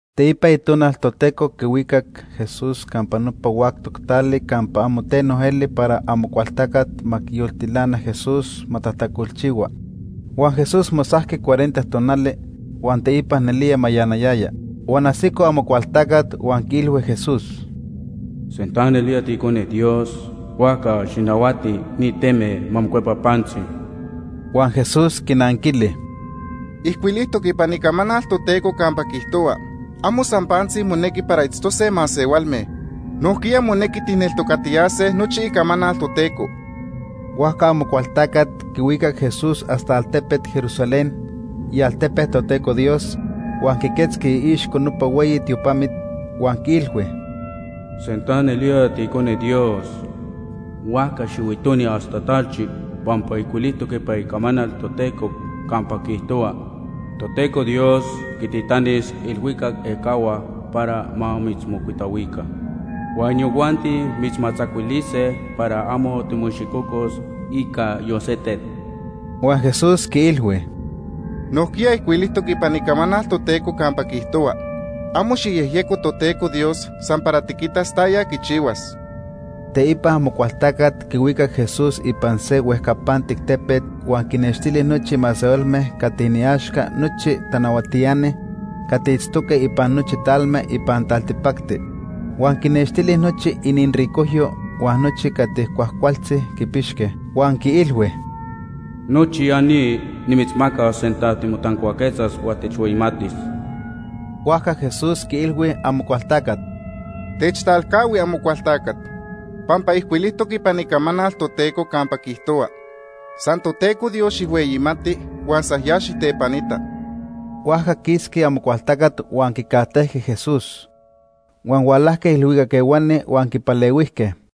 Teipa Itonal Toteco quihuicac Jesús campa nopa huactoc tali campa amo teno eli para Amocualtacat ma quiyoltilana Jesús ma tajtacolchihua. Huan Jesús mosajqui cuarenta tonali, huan teipa nelía mayanayaya. Huan ajsico Amocualtacat huan quiilhui Jesús: ―Sinta nelía tiIcone Dios, huajca xijnahuati ni teme ma mocuepa pantzi. Huan Jesús quinanquili: ―Ijcuilijtoc ipan Icamanal Toteco campa quiijtohua: ‘Amo san pantzi monequi para itztose masehualme. Nojquiya monequi tijneltocatiyase nochi Icamanal Toteco.’ Huajca Amocualtacat quihuicac Jesús hasta altepet Jerusalén, ialtepe Toteco Dios, huan quiquetzqui iixco nopa hueyi tiopamit, huan quiilhui: ―Sinta nelía tiIcone Dios, huajca xihuitoni hasta talchi pampa ijcuilijtoc ipan Icamanal Toteco campa quiijtohua: ‘Toteco Dios quintitanis iilhuicac ejcahua para ma mitzmocuitahuica, huan inijuanti mitzmatzacuilise para amo timoicxicocos ica yon se tet.’ Huan Jesús quiilhui: ―Nojquiya ijcuilijtoc ipan Icamanal Toteco campa quiijtohua: ‘Amo xijyejyeco Toteco Dios san para tiquitas taya quichihuas.’ Teipa Amocualtacat quihuicac Jesús ipan se huejcapantic tepet huan quinextili nochi masehualme cati iniaxca nochi tanahuatiani cati itztoque ipan nochi talme ipan taltipacti. Huan quinextili nochi iniricojyo huan nochi cati cuajcualtzi quipixque, huan quiilhui: ―Nochi ya ni nimitzmacas sinta timotancuaquetzas huan techhueyimatis. Huajca Jesús quiilhui Amocualtacat: ―Techtalcahui Amocualtacat. Pampa ijcuilijtoc ipan Icamanal Toteco campa quiijtohua: ‘San Toteco Dios xijhueyimati huan san ya xijtepanita.’ Huajca quisqui Amocualtacat huan quicajtejqui Jesús. Huan hualajque ilhuicac ehuani huan quipalehuijque.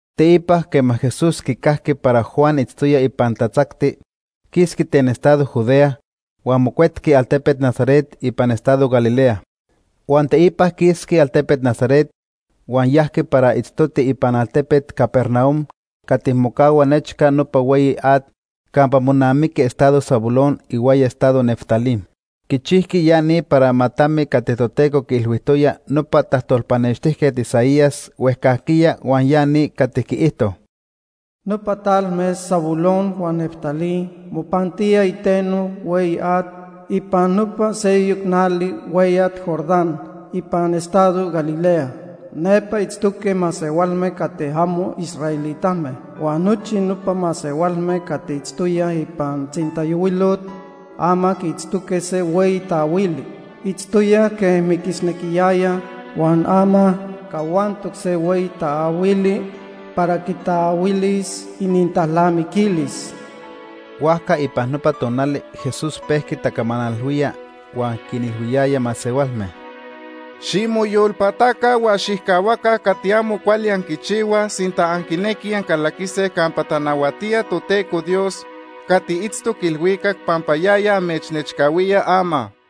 Teipa quema Jesús quicajqui para Juan itztoya ipan tatzacti, quisqui ten estado Judea, huan mocuetqui altepet Nazaret ipan estado Galilea. Huan teipa quisqui altepet Nazaret, huan yajqui para itztoti ipan altepet Capernaum cati mocahua nechca nopa hueyi at campa monamiqui estado Zabulón ihuaya estado Neftalí. Quichijqui ya ni para ma tami cati Toteco quiilhuijtoya nopa tajtolpanextijca Isaías huejcajquiya huan ya ni cati quiijto: “Nopa talme Zabulón huan Neftalí mopantíaj iteno hueyi at ipan nopa seyoc nali hueyat Jordán ipan estado Galilea. Nepa itztoque masehualme cati amo israelitame. Huan nochi nopa masehualme cati itztoyaj ipan tzintayohuilot, ama quiitztoque se hueyi taahuili. Itztoyaj quej miquisnequiyayaj, huan ama cahuantoc se hueyi taahuili para quitaahuilis inintalnamiquilis.” Huajca ipan nopa tonali Jesús pejqui tacamanalhuía huan quinilhuiyaya masehualme: “Ximoyolpataca huan xijcahuaca cati amo cuali anquichihuaj sinta anquinequij ancalaquise campa tanahuatía Toteco Dios cati itztoc ilhuicac pampa yaya amechnechcahuía ama.”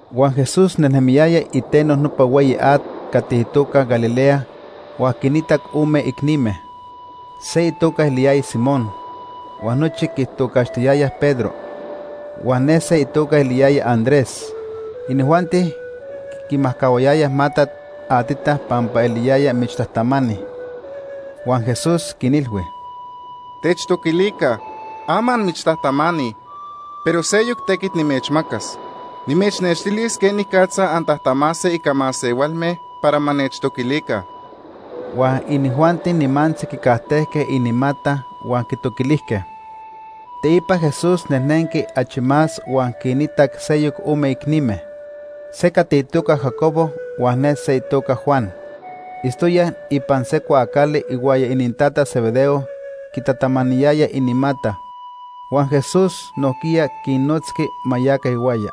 Huan Jesús nejnemiyaya iteno nopa hueyi at cati itoca Galilea huan quinitac ome icnime: se itoca eliyaya Simón, huan nochi quitocaxtiyayaj Pedro, huan ne se itoca eliyaya Andrés. Inijuanti quimajcahuayayaj matat atita pampa eliyayaj michtajtamani. Huan Jesús quinilhui: ―Techtoquilica. Ama anmichtajtamani, pero seyoc tequit nimechmacas. Nimechnextilis quenicatza antajtamase ica masehualme para ma nechtoquilica. Huan inijuanti nimantzi quicajtejque inimata huan quitoquilijque. Teipa Jesús nejnenqui achi más huan quinitac seyoc ome icnime: se cati itoca Jacobo huan ne se itoca Juan. Itztoyaj ipan se cuaacali ihuaya inintata Zebedeo quitatamaniyayaj inimata. Huan Jesús nojquiya quinnotzqui ma yaca ihuaya.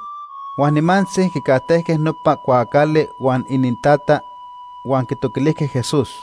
Huan nimantzi quicajtejque nopa cuaacali huan inintata, huan quitoquilijque Jesús.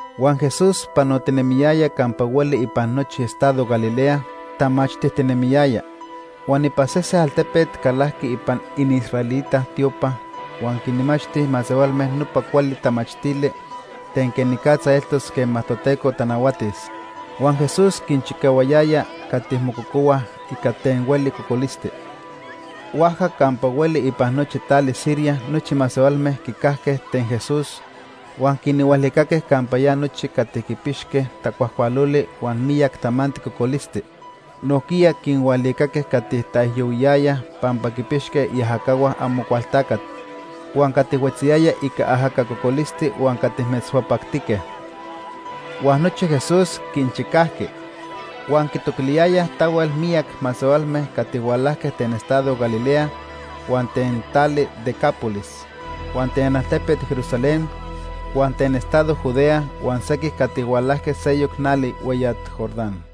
Huan Jesús panotinemiyaya campa hueli ipan nochi estado Galilea, tamachtijtinemiyaya. Huan ipan sese altepet calajqui ipan iniisraelita tiopa huan quinmachti masehualme nopa cuali tamachtili ten quenicatza eltos quema Toteco tanahuatis. Huan Jesús quinchicahuayaya cati mococohuaj ica ten hueli cocolisti. Huajca campa hueli ipan nochi tali Siria nochi masehualme quicajque ten Jesús, huan quinhualicaque campa ya nochi cati quipixque tacuajcualoli huan miyac tamanti cocolisti. Nojquiya quinhualicaque cati taijyohuiyayaj pampa quinpixque iajacahua Amocualtacat, huan cati huetziyayaj ica ajaca cocolisti huan cati metzhuapactique. Huan nochi Jesús quinchicajqui. Huan quitoquiliyayaj tahuel miyac masehualme cati hualajque ten estado Galilea, huan ten tali Decápolis, huan ten altepet Jerusalén, huan ten estado Judea huan sequij cati hualajque seyoc nali hueyat Jordán.